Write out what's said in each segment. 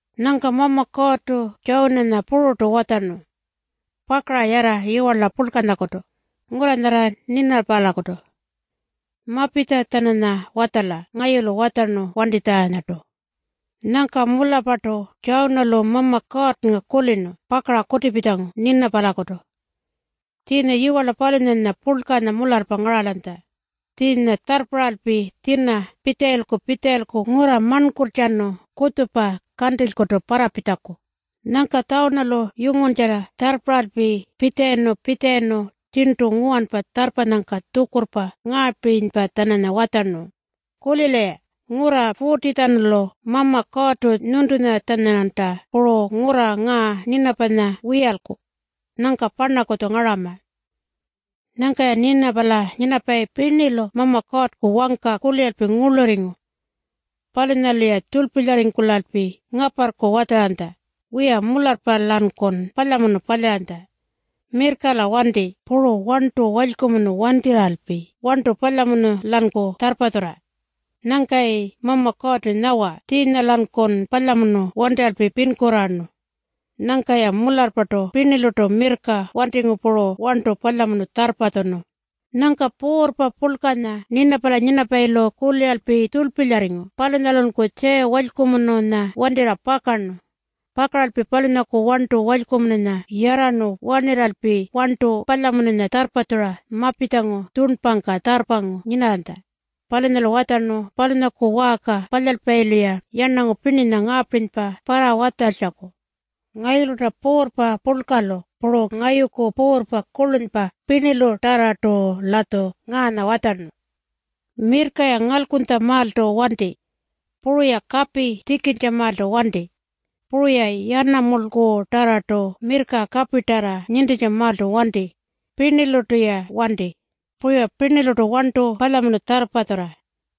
Nyangka Mama Kuurrtu Tjawunanya pururtu watjarnu, “Pakara yarra yiwarla purlkanyakutu, ngurra nyarra Ninapalakutu. Mapitja-tjananya watjala ngayulu watjarnu wantitjanyartu.” Nyangka mularrpartu Tjawunalu Mama Kuurrnga kulirnu pakara kutipitjangu Ninapalakutu. Tjiinya yiwarla palunyanya purlkanya mularrpa ngaralanytja. Tjiinya tjarrparralpi tjina pitjalayilku-pitjalayilku ngurra marnkurrtjanu kutjupa kantilykutu parrapitjaku. Nyangka Tjawunalu yunguntjarra tjarrparralpi pitjalayirnu-pitjalayirnu tjirntu nguwanpa tjarrpanyangka tjukurrpa ngaapirinypa-tjananya watjarnu, “Kulila-ya. Ngurra 40-tjanulu Mama Kuurrtu nyuntunya-tjananyanta puru ngurra ngaa Ninapanya wiyalku. Nyangka parnakutju ngarama.” Nyangka-ya Ninapala nyinapayi pirnilu Mama Kuurrku wangka kuliralpi ngurlurringu. Palunyalu-ya tjurlpilyarringkulalpi ngaparrku watjaranytja, “Wiya, mularrpa-lankun palyamunu palyaranytja. Mirrka-la wanti puru warntu walykumunu wantirralpi warntu palyamunu-lanku tjarrpatjurra. Nyangkayi Mama Kuurrtu nyawa tjiinya-lankun palyamunu wantirralpi pinkurraarnu.” Nyangka-ya mularrpartu pirnilurtu mirrka wantingu puru warntu palyamunu tjarrpatjunu. Nyangka puurrpa purlkanya Ninapala nyinapayilu kuliralpi tjurlpilyarringu palunyalunku tjiya walykumununya wantirra pakarnu. Pakaralpi palunyaku warntu walykumununya yarrarnu warnirralpi warntu palyamununya tjarrpatjura mapitjangu tjurnpangka tjarrpangu nyinarranytja. Palunyalu watjarnu palunyaku waarka palyalpayilu-ya yarnangu pirninya ngaapirinypa parrawatjaltjaku: “Ngayulu-rna puurrpa purlkanyalu puru ngayuku puurrpa kurlunypa pirnilutarrartu-latju ngaanya watjarnu, ‘Mirrka-ya ngalkunytjamaaltu wanti. Puru-ya kapi tjikintjamaaltu wanti. Puru-ya yanamulkutarrartu mirrka kapitarra nintintjamaaltu wanti. Pirnilurtu-ya wanti. Puru-ya pirnilurtu warntu palyamunu tjarrpatjurra.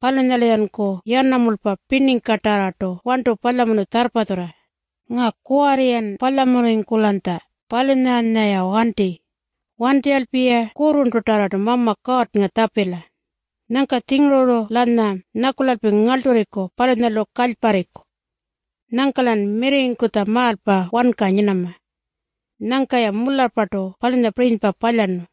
Palunyalu-yanku yanamulpa pirningkatarrartu warntu palyamunu tjarrpatjurra. Ngaa kuwarri-yan palyamunurringkulanytja, palunyanya-ya wanti. Wantirralpi-ya kurrurntutarrartu Mama Kuurrnga tjapila. Nyangka-tjinguru-lanya nyakulalpi ngarlturriku palunyalu kalyparriku. Nyangka-lan mirrirringkutjamaalpa wanka nyinama.’” Nyangka-ya mularrpartu palunyapirinypa palyarnu.